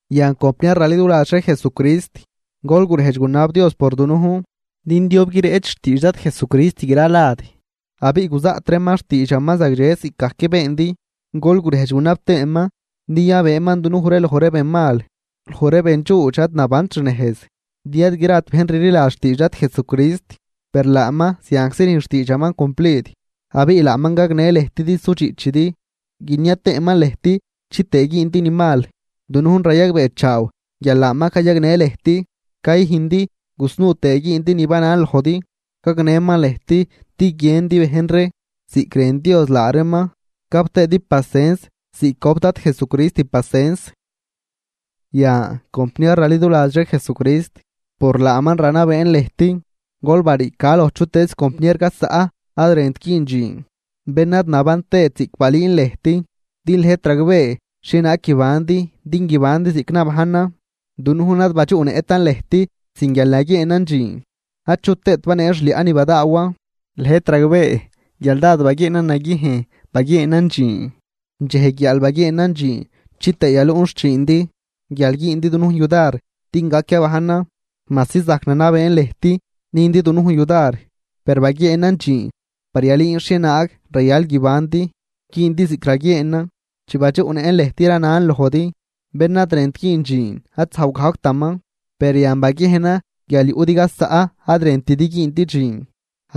Yan, compniar raliduladx ree Jesucrist, gol gurejdx gunab Dios por dunujn din diob guireꞌch xtiidx Dad Jesucrist gralad, abiꞌ guzaꞌt reeman xtiidxaman zagdxe ziꞌcgajc beendi. Gol gurejdx gunab tëëman din yabëëman dunujn loj ree benmal, loj ree bendxuudx ad nabant xnejz, din ad grat bejn rliladx xtiidx Dad Jesucrist. Per laaman zianczi rüjn xtiidxaman cumplid, abiꞌ laaman gagnë lëjt din sudxiꞌchidi, guinia tëëman lëjt chitëë güündi ni mal. Dunujn rayagbeechaaw guial laaman cayagnë lëjt cayüjndi gusnuu tëë güündi ni banan lojdi. Gagnëman lëjt din guiëndi bejn ree ziꞌc rën Dios laa reeman gap tëëdi pacens ziꞌc gojp Dad Jesucrist pacens. Yan, compniar raliduladx ree Jesucrist, por laaman ranabeen lëjt: Gol bariica loj chutëëz compniar gaz zaꞌ ad rënt güün dxiin, bén ad naban tëët ziꞌc balüün lëjt. Din lëjt ragbee xhienaag guibandi din guibandi ziꞌc nabajnan. Dunujn ad badxuꞌnëꞌtan lëjt sin guial naguieenan dxiin, achu tëët banee xliaꞌ ni badaawan. Lëjt ragbee guial dád baguieenan naguiejn baguieenan dxiin, dxej guiaal baguieenan dxiin chitëë yaluꞌn xchiindi guial güündi dunujn yudar din gac yabajnan. Majsi zajc nanabeen lëjt nüjndi dunujn yudar, per baguieenan dxiin par yalüün xhienaag rayal guibandi güündi ziꞌc raguieenan. Chi badxuꞌnëꞌn lëjt, ranan lojdi: Bén ad rënt güün dxiin, ad zajw gajctaman. Per yan baguiejnan guial yuꞌdi gaz zaꞌ ad rëntidi güündi dxiin,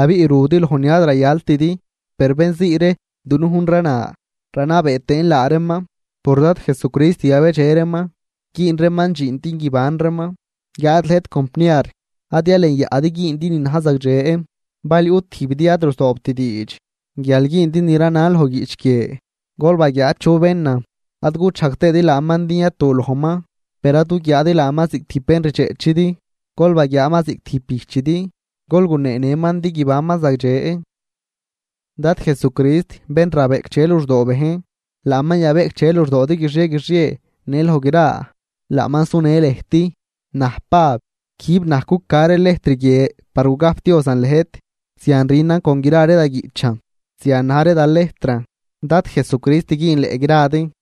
abiꞌ rudi loj ni ad rayaltidi. Par bén zii ree dunujn rana ranabee tëën laa reeman por Dad Jesucrist yabedxe reeman, güün reeman dxiin din guiban reeman. Guiáad lëjt compniar, ad yalenyaꞌdi güündi ni na̱j zagdxe. Bal yuꞌ tijbidi ad ruzoobt diidx guial güündi ni ranan loj guiꞌch guie, gol baguiaa chu benan, ad guchajg tëëdi laaman din yatu lojman. Per ad guguiaadi laaman ziꞌc tijb bén rdxeꞌchidi, gol baguiaaman ziꞌc tijb bijchidi, gol guneenëman din guibanman zagdxe. Dad Jesucrist bén rabeꞌcdxe luxdoo bejn, laaman yabeꞌcdxe luxdoodi guixie guixie në loj gra. Laaman sunë lëjt. Naj, Pab, quijb naj cuca ree lejtr guie par gugajpdiozan lëjt. Zian rünan con gra ree da guiꞌchan, zian na̱j ree da lejtran. Dad Jesucrist güünleꞌ gradi.